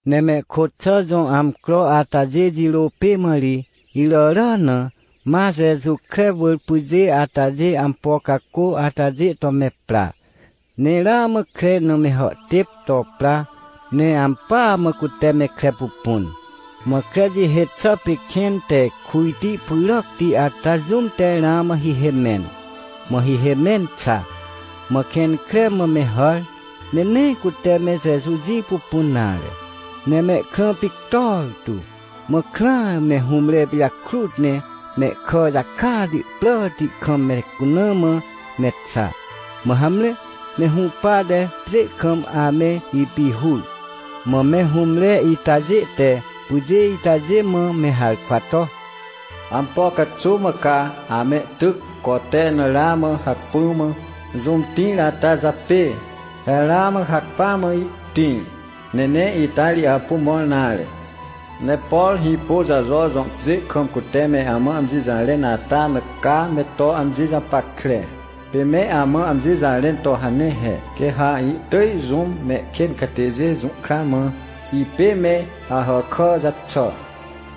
Ne mehkôt xà jõ amcro atajê jirô pê mã ri, iràrà na, ma Jeju kre wỳr pyjê atajê ampo cacô atajê to me pra. Ne ramã kre na me hàhtêp to pra, ne ampỳa mã cute me kre pupun. Mã kre jihê xà pê kẽn te kujti pyràcti ata jũm te ramã hihê mẽn, mã hihê mẽn xa. Mã kẽn kre mã me hàr, ne nee cute me Jeju jĩ pupun nare, ne mehkrã pictor tu. Mã krãa, me hũmre pijakrut ne mehkà jakati pràti kam me cuna mã me xa. Mã hamre, me hũpate pjê kam ame ipihur. Mã me hũmre itajê te pyjê itajê mã me harkwa to: ― Ampo caxuw mã ca amehtyc cote na ramã hacpỹa mã jũm tĩr ata japê? He ramã hacpỹa mã ihtĩr, ne nee ita ri apu mõr nare, ne por Hĩpôjajo jõ pjê kam cute me amã amji jarẽn ata na ca me to amji japackre. Pê me amã amji jarẽn to hane he: “Quê ha ihtỳj jũm mehkên catêjê jũhkra mã, ipê me Ahàkà jaxà,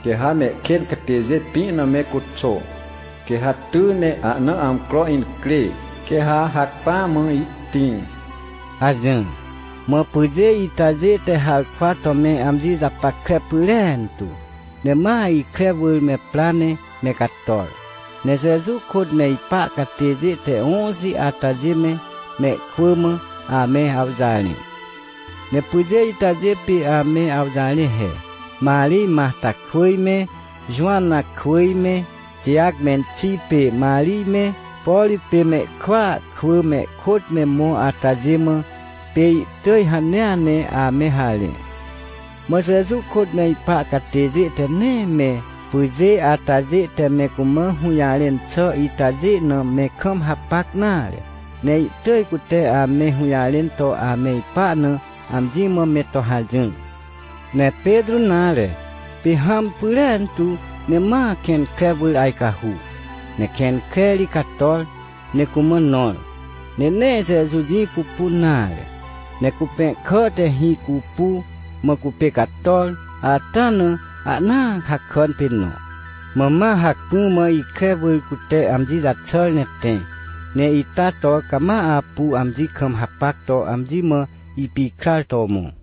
quê ha mehkên catêjê pĩ na me cuxô. Quê ha ty ne ahna amcro incrê, quê ha hacpỹa mã ihtĩr” ― hajỹr. Mã pyjê itajê te harkwa to me amji japackre pyrentu. Ne ma ikre wỳr me pra ne me cator, ne Jeju kôt me ipa catêjê te õxi atajê me, mehkwỳ mã, ame awjarẽ. Ne pyjê itajê pê ame awjarẽ he: Marij Matarkwỳj me, Jowanakwỳj me, Tijac menxi pê Marij me, por pê mehkwỳa kwỳ mehkôt me mõ atajê mã, pê ihtỳj hanea ne ame harẽ. Mã Jeju kôt me ipa catêjê te nee me pyjê atajê te me cumã hũjarẽn xà itajê na me kam hapac nare, ne ihtỳj cute ame hũjarẽn to ame ipa na, amji mã me to hajỹr. Ne Petrô nare, pê hãm pyrentu ne ma kẽn kre wỳr ajcahu. Ne kẽn kre ri cator, ne cumã nõr, ne nee Jeju jĩ pupun nare, ne cupẽhkà te hĩ cupu, mã cupê cator ata na, ahnaa hakàn pê nõ. Mã ma hacpỹ mã ikre wỳr cute amji jaxàr ne tẽ, ne ita to cama apu amji kam hapac to amji mã ipikrar to mõ.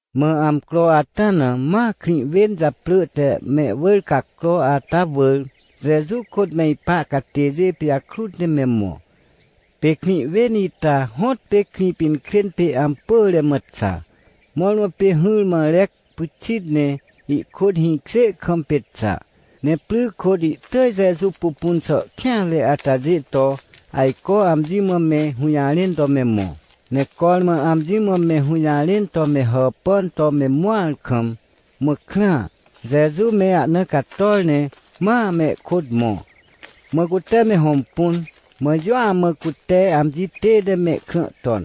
Mã amcro ata na ma krĩ wên japrỳ te Mewỳrcacro ata wỳr Jeju kôt me ipa catêjê pijakrut ne me mõ. Pê krĩ wên ita hõtpê Krĩpinkrên pê ampỳre mã xa, mõrmõ pê hỹrmã rec pyxit ne ihkôt hĩkjê kam pê xa. Ne pry kôt ihtỳj Jeju pupun xà kêanre atajê to, ajco amji mã me hũjarẽn to me mõ. Ne cormã amji mã me hũjarẽn to me hàhpan to me mõar kam, mã krãa, Jeju me ahna cator ne ma mehkôt mõ. Mã cute me hõmpun, mã jũa mã cute amji tête mehkrã ton,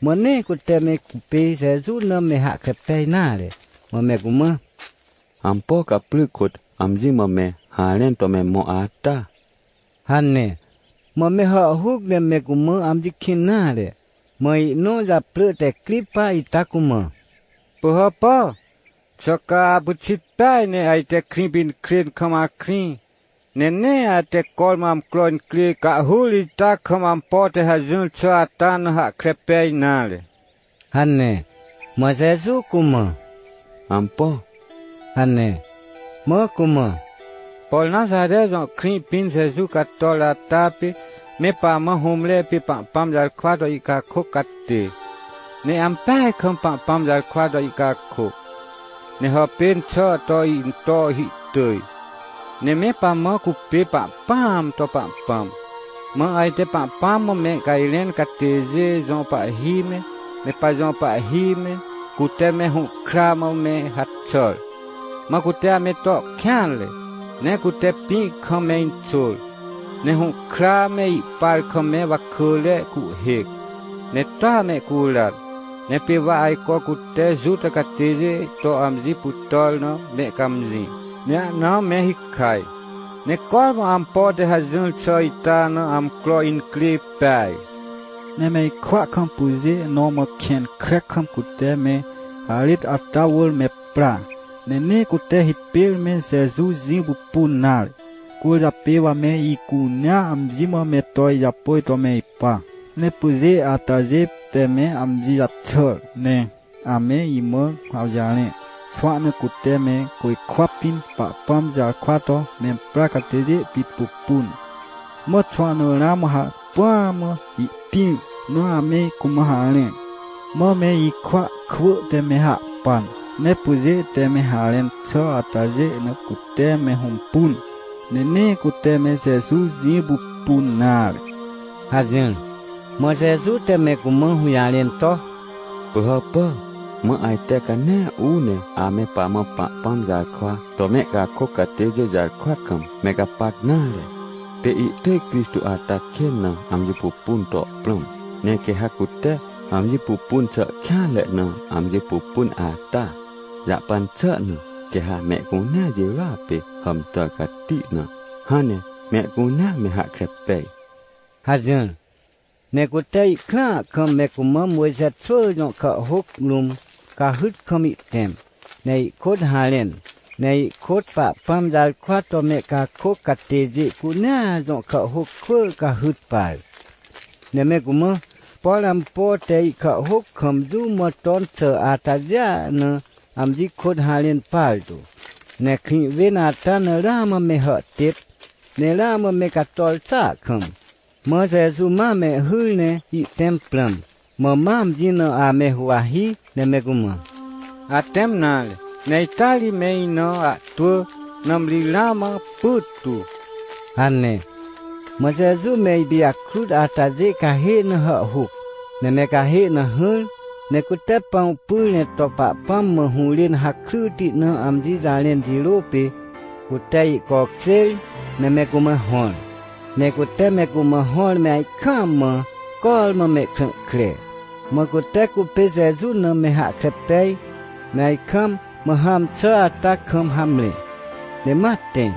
mã nee cute me cupê Jeju na me hahkre pej nare. Mã me cumã: ― Ampo ca pry kôt amji mã me harẽn to me mõ ata? ― hane. Mã me hàhhuc ne me cumã amji kĩn nare. Mã ihnõ japrỳ te Cripa ita cumã: ― Pỳhàpà, xà ca apyxit peaj ne ajte Krĩpinkrên kam akrĩ, ne nee ate cormã amcro incrê cahhur ita kam ampo te hajỹr xà ata na hahkre pej nare? ― hane. Mã Jeju cumã: ― Ampo? ― hane. Mã cumã: ― Por Naxare jõ krĩ pĩn Jeju cator ata pê me pamã hũmre pê Pahpãm jarkwa to ihcakôc catê. Ne ampeaj kam Pahpãm jarkwa to ihcakôc, ne hàpên xà to into hihtỳj, ne me pamã cupê Pahpãam to Pahpãm. Mã ajte Pahpãm mã mehcajrẽn catêjê jõ pahhi me, me pajõ pahhi me, cute me hũhkra mã me haxàr, mã cute ame to kêanre. Ne cute pĩ kam me inxôr, ne hũhkra me ihpar kam me wakỳre cuhhêc, ne toa mehcuran. Ne pê wa ajco cute Juta catêjê to amji pytàr na mehcãmjĩ, ne ahna me hikaj. Ne cormã ampo te hajỹr xà ita na amcro incrê peaj. Ne me ikwỳa kam pyjê nõ ma kẽn kre kam cute me harêt ata wỳr me pra. Ne nee cute hipêr me Jeju jĩ pupun nare. Cwỳrjapê wa me icunea amji mã me to ijapôj to me ipa. Ne pyjê atajê te me amji jaxàr ne ame imã awjarẽ, xwahna cute me côjkwa pĩn Pahpãm jarkwa to memprar catêjê pit pupun. Mã xwahna ramã hacpỹa mã ihtĩr na ame cumã harẽ. Mã me ikwỳa kwỳ te me hahpan, ne pyjê te me harẽn xà atajêa na cute me hõmpun, ne nee cute me Jeju jĩ pupun nare ― hajỹr. Mã Jeju te me cumã hũjarẽn to: ― Pỳhàpà, mã ajte ca nee uu ne ame pamã Pahpãm jarkwa to mehcakôc catêjê jarkwa kam me gapac nare. Pê ihtỳj Crixtô ata kên na amji pupun to prãm. Ne quê ha cute amji pupun xà kêanre na amji pupun ata jahpan xà na, quê ha mehcunea jirôa pê hàmtàr cati na, hãn ne mehcunea me hahkre pej ― hajỹr. Ne cute ihkrãa kam me cumã Mojxe xwỳ jõ kàhhôc rũm cahyt kam ihtẽm, ne ihkôt harẽn, ne ihkôt Pahpãm jarkwa to mehcakôc catêjê cunea jõ kàhhôc kwỳ cahyt par. Ne me cumã, por ampo te ihkàhhôc kam jũ mã ton xà atajêa na amji kôt harẽn partu. Ne krĩ wên ata na ramã me hàhtêp, ne ramã me cator xàa kam, mã Jeju ma mehhyr ne ihtẽm prãm. Mã ma amji na ame huwahi, ne me cumã: ― Atẽm nare, ne ita ri me ina ahtwỳ, nãmri ramã pyttu ― hane. Mã Jeju me ipijakrut atajê cahê na hàhhuc. Ne me cahê na hỹr, ne cute pãw pyr ne to Pahpãm mã hũrên hakryti na amji jarẽn jirô pê, cute ihcokjêr ne me cumã hõr. Ne cute me cumã hõr me ajkaam mã cormã mehkrã kre, mã cute cupê Jeju na me hahkre pej, me ajkaam, mã hãm xà ata kam hamre, ne ma tẽ.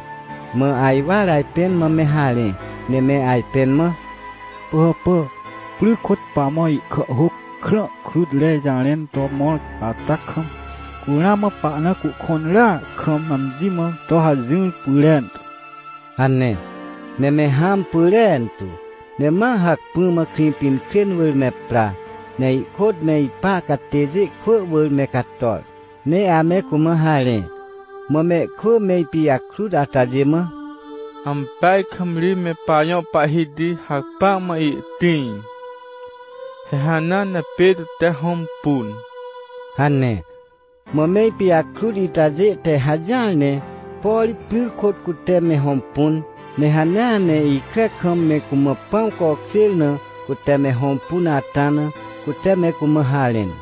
Mã ajwar ajpẽn mã me harẽ, ne me ajpẽn mã: ― Pỳhàpà, pry kôt pamã ihkàhhôc krã krutre jarẽn to mõr ata kam, cu ramã pahna cuhkõnrea kam amji mã to hajỹr pyrentu ― hane. Ne me hãm pyrentu, ne ma hacpỹ mã Krĩpinkrên wỳr me pra, ne ihkôt me ipa catêjê kwỳ wỳr me cator, ne ame cumã harẽ. Mã mehkwỳ me ipijakrut atajê mã: ― Ampeaj kam ri me pajõ Pahhiti hacpỹa mã ihtĩr! He hanea Petrô te hõmpun! ― hane. Mã me ipijakrut itajê te hajỹar ne, por pry kôt cute me hõmpun, ne hanea ne ikre kam me cumã pãw cokjêr na cute me hõmpun ata na, cute me cumã harẽn.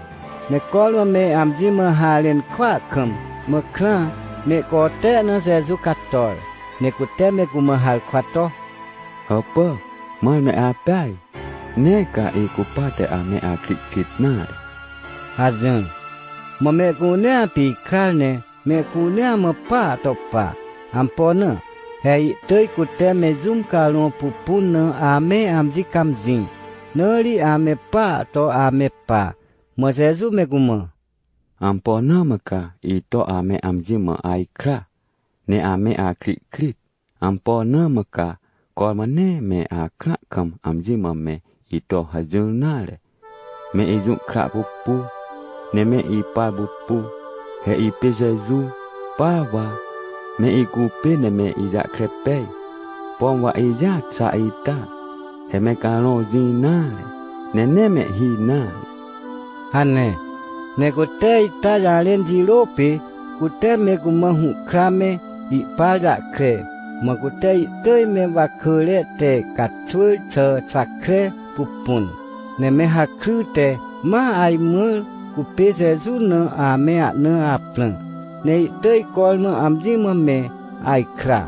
Ne cormã me amji mã harẽn kwaa kam, mã krãa, mehcote na Jeju cator, ne cute me cumã harkwa to: ― Hàpà, mãr me apeaj? Nee ca icupate ame akrihkrit nare ― hajỹr. Mã mehcunea pikrar ne mehcunea mã paa to pa. Ampo na? He ihtỳj cute me jũm carõ pupun na ame amji cãmjĩ, na ri ame paa to ame pa. Mã Jeju me cumã: ― Ampo na mã ca ito ame amji mã ajkra, ne ame ahkrihkrit? Ampo na mã ca cormã nee me akrã kam amji mã me ito hajỹr nare? Me ijũhkra pupu, ne me ipar pupu. He ipê Jeju, pa wa. Me icupê ne me ijahkre pej, pom wa ijĩa xa ita. He me carõ jĩ nare, ne nee mehhi nare ― hane. Ne cute ita jarẽn jirô pê cute me cumã hũhkra me ihpar jahkre, mã cute ihtỳj me wakỳre te caxwỳr xà xwa kre pupun. Ne me hakryte ma ajmãr cupê Jeju na ame ahna aprã. Ne ihtỳj cormã amji mã me ajkra.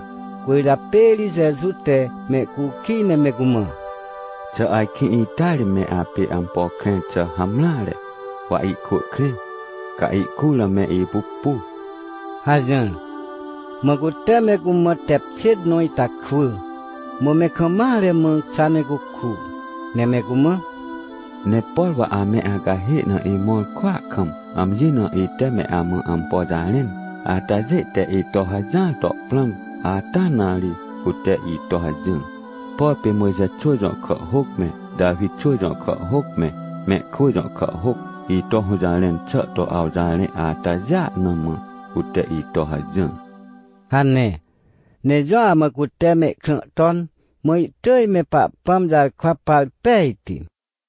Cwỳrjapê ri Jeju te mehcukij ne me cumã: ― Xà ajkĩ ita ri me apê ampo krẽr xà hamreare? Wa ihkwỳ krẽ, ca ihkur na me ipupu ― hajỹr. Mã cute me cumã tep xêt nõ ita kwỳ. Mã me kam mare mã xa ne cuku. Ne me cumã: ― Ne por wa ame acahê na imõr kwỳa kam, amji na ite me amã ampo jarẽn atajê te ito hajỹr to prãm, ata na ri cute ito hajỹr. Por pê Mojxe xwỳ jõ kàhhôc me, Tawi xwỳ jõ kàhhôc me, mehkwỳ jõ kàhhôc ito hũjarẽn xà to awjarẽ atajêa na mã, cute ito hajỹr ― hane. Ne jũa mã cute mehkrã ton, mã ihtỳj me Pahpãm jarkwa par pejti.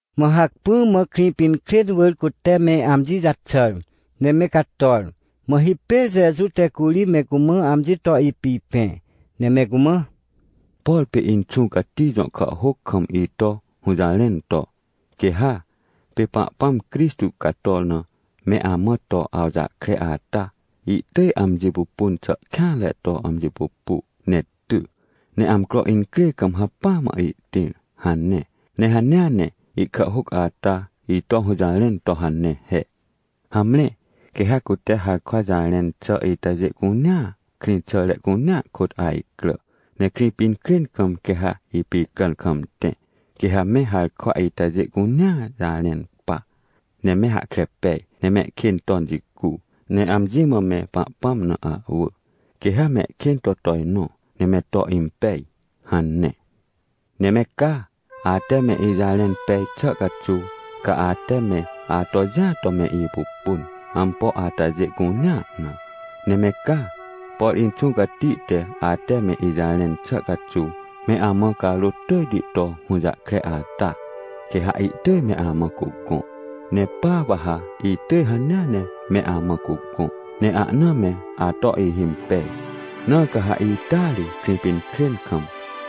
Mã hacpỹ mã Krĩpinkrên wỳr cute me amji jaxàr ne me cator. Mã hipêr Jeju te curi me cumã amji to ipipẽ, ne me cumã: ― Por pê Inxũ Cati jõ kàhhôc kam ito hũjarẽn to: “Quê ha, pê Pahpãm Crixtô cator na me amã to awjahkre ata, ihtỳj amji pupun xà kêanre to amji pupu ne ty. Ne amcro incrê kam hacpỹa mã ihtĩr” hane. ― Ne hanea ne ihkàhhôc ata ito hũjarẽn to hane he: “Hamre, quê ha cute harkwa jarẽn xà itajê cunea, krĩxàre cunea kôt ajcrà. Ne Krĩpinkrên kam quê ha ipicràn kam tẽ, quê ha me harkwa itajê cunea jarẽn pa, ne me hahkre pej, ne mehkên ton jicu, ne amji mã me Pahpãm na ahwỳ, quê ha mehkên to tojnõ ne me to impej” hane. ― Ne me ca, ate me ijarẽn pej xà caxuw ca ate me ato jĩa to me ipupun, ampo atajê cunea na. Ne me ca, por Inxũ Cati te ate me ijarẽn xà caxuw me amã carôt tỳjti to hũjahkre ata, quê ha ihtỳj me amã cugõ. Ne pa wa ha itỳj hanea ne me amã cugõ, ne ahna me ato ihimpej. Na ca ha ita ri, Krĩpinkrên kam,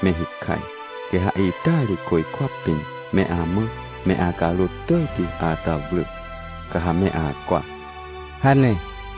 me hikaj. Quê ha ita ri côjkwa pĩn, me amã me acarôt tỳjti ata wrỳ, ca ha me acwa ― hane.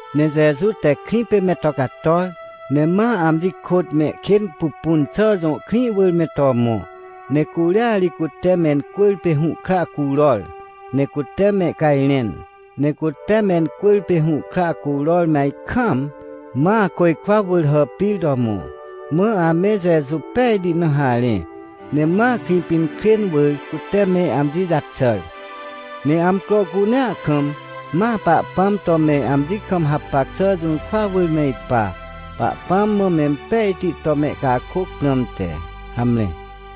Ne Jeju te krĩ pê me to cator, ne ma amji kôt Mehkênpupunxà jõ krĩ wỳr me to mõ, ne curia ri cute mencwỳrpê hũhkra curor, ne cute mehcajrẽn. Ne cute mencwỳrpê hũhkra curor me ajkaam, ma côjkwa wỳr hàpir to mõ. Mã ame Jeju pejti na harẽ, ne ma Krĩpinkrên wỳr cute me amji jaxàr. Ne amcro cunea kam, ma Pahpãm to me amji kam hapac xà jũrkwa wỳr me ipa, Pahpãm mã mempejti to mehcakôc prãmte. Hamre.